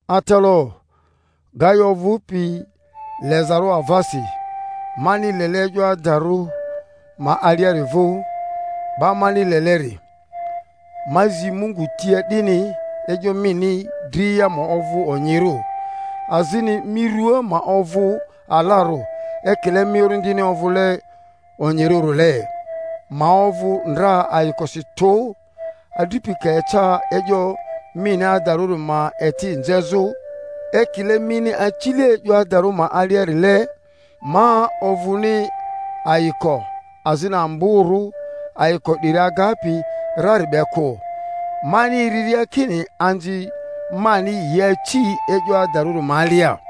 Atalaᴜ, Gayo ovᴜpi lezarᴜ avasi, mani lele e'yo adarᴜ ma aliari vᴜ. 'Ba mani leleri, ma zi Mungu tia 'dini e'yo mini dria ma ovᴜ onyirᴜ, azini mi rua ma ovᴜ alarᴜ, ekile mi orindini ovᴜle onyirᴜrile. Ma ovᴜ ndra ayikosi tᴜ, adripi ka eca e'yo mini adarᴜri ma eti nzezᴜ, ekile mini acile e'yo adarᴜ ma aliarile. Ma ovᴜni ayiko azini amborᴜ ayiko 'diri agapi rari be kᴜ, mani eriria kini anzi mani yi aci e'yo adarᴜri ma alia.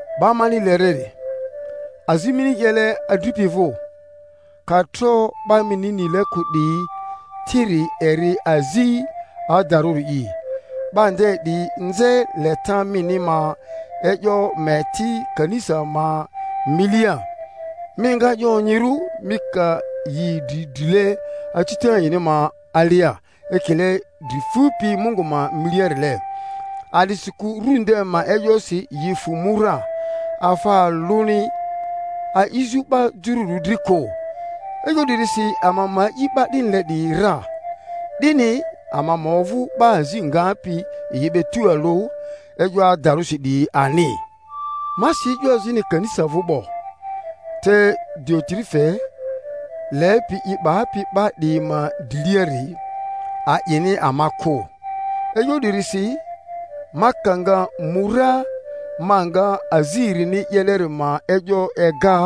'Ba mani leleri, azi mini 'yele adripi vᴜ, ka tro 'ba mini nile kᴜ 'diyi tiri eri azi adarᴜri'i. 'Ba nde 'diyi nze leta mini ma e'yo ma eti kanisa ma milia. Mi nga 'ye onyirᴜ mi ka yi idri drile acita yini ma alia ekile dri fupi Mungu ma miliarile. A'disikᴜ Ru nde ma e'yosi yi fᴜ mu ra, afa alᴜni a'izᴜ 'ba jururᴜ dri kᴜ. E'yo 'dirisi ama ma a'i 'ba 'dinile 'diyi ra, 'dini ama ma ovᴜ 'ba azi ngapi yi be tualᴜ e'yo adarᴜsi 'diyi ani. Ma si e'yo azini kanisa vᴜ 'bo; te Diotrefe, lepi i 'bapi 'ba 'diyi ma driliari, a'ini ama kᴜ. E'yo 'dirisi, ma ka nga mu ra, ma nga azi erini 'yeleri ma e'yo ega,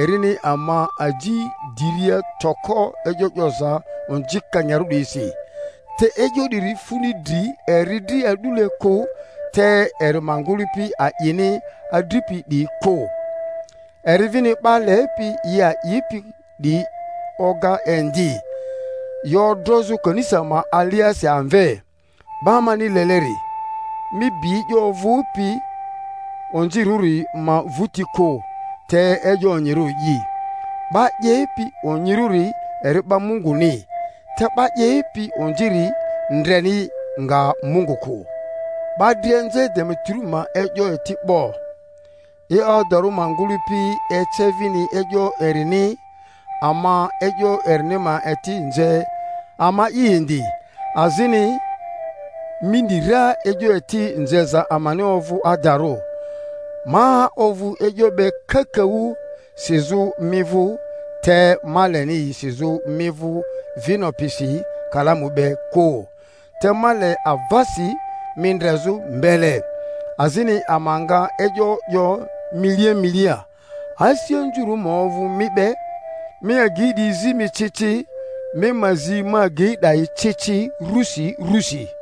erini ama aji diria toko e'yo 'yoza onzikanyarᴜ 'diyisi. Te e'yo 'diri funi dri eri dri a'dule kᴜ, te eri ma ngᴜlᴜpi a'ini adripi 'diyi kᴜ, eri vini 'ba lepi yi a'ipi 'diyi oga indi, yi odrozᴜ kanisa ma aliasi amve. 'Ba mani leleri, mi bi e'yo ovᴜpi onzirᴜri ma vᴜti kᴜ, te e'yo onyirᴜri'i. 'Ba 'yepi onyirᴜri eri 'ba Munguni, te 'ba 'yepi onziri ndreni nga Mungu kᴜ. 'Ba dria nze Demeterio ma e'yo eti 'bo, e'yo adarᴜ ma ngᴜlᴜpi ece vini e'yo erini; ama e'yo erini ma eti nze ama'i indi, azini mi ni ra e'yo eti nzeza amani ovᴜ adarᴜ. Ma ovᴜ e'yo be kakaᴜ sizᴜ mi vᴜ, te ma leni yi sizᴜ mi vᴜ vino pisi kalamu be kᴜ; te ma le avasi mi ndrezᴜ mbele, azini ama nga e'yo 'yo milia milia. Asi anzurᴜ ma ovᴜ mi be. Mi agyi 'diyi zi mi ci ci. Mi ma zi ma agyi 'dayi ci ci rusi rusi.